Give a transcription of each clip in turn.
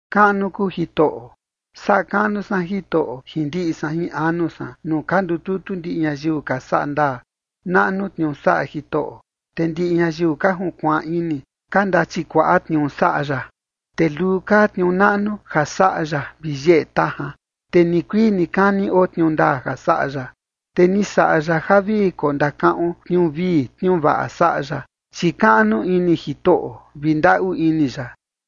¡Kaꞌnu kuu Jitoꞌo! Saꞌa kaꞌnu san Jitoꞌo jin ndiꞌi san jin anu san nuu ka ndututu ndiꞌi ñayiu ka saꞌa ndaa. Naꞌnu tniuu saꞌa Jitoꞌo, te ndiꞌi ñayiu ka junkuaan ini, ka ndachikuaꞌa tniuu saꞌa ya. Te luu kaa tniuu naꞌnu ja saꞌa ya vi yeꞌe tajan, te nikuii nikani oo tniuu ndaa ja saꞌa ya. Te ni saꞌa ya ja vi kondakaꞌon tniuu vii tniuu vaꞌa saꞌa ya, chi kaꞌnu ini Jitoꞌo vi ndaꞌu ini ya.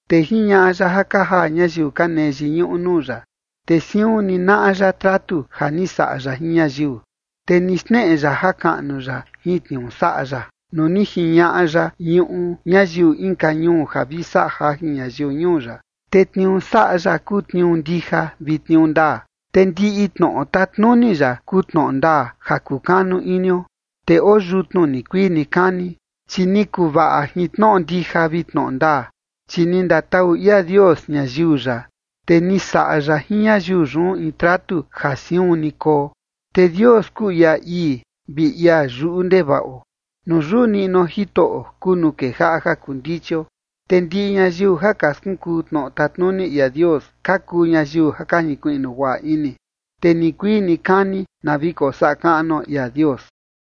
Te jiñaꞌa ya ja ka jaa ñayiu ka nee yiñuꞌu nuu ya, te siun ni naꞌa ya tratu ja ni saꞌa ya jin ñayiu. Te ni xneꞌe ya jakaꞌnu ya jin tniuu saꞌa ya nuu ni jiñaꞌa ya ñuꞌu ñayiu inka ñuu ja vi saꞌa jajin ñayiu ñuu ya. Te tniuu saꞌa ya kuu tniuu ndija vi tniuu ndaa, te ndiꞌi tnoꞌo tatnuni ya kuu tnoꞌo ndaa ja kukanu inio. Te oo yutnu nikuii nikani, chi ni kuvaꞌa jin tnoꞌo ndija vi tnoꞌo ndaa. Chi ni ndatau ia Dios ñayiu ya, te ni saꞌa ya jin ñayiu yun in tratu ja siun ni koo. Te Dios kuu ia ii vi ia yuꞌu ndevaꞌo. Nuu yuꞌu niꞌnuo Jitoꞌo kuu nuu kejaꞌa ja kuu ndichio, te ndiꞌi ñayiu ja ka skunkuu tnoꞌo tatnuni ia Dios ka kuu ñayiu ja ka jinkuiꞌnu guaꞌa ini. Te nikuii nikani na vi kosaꞌa kaꞌnuo ia Dios.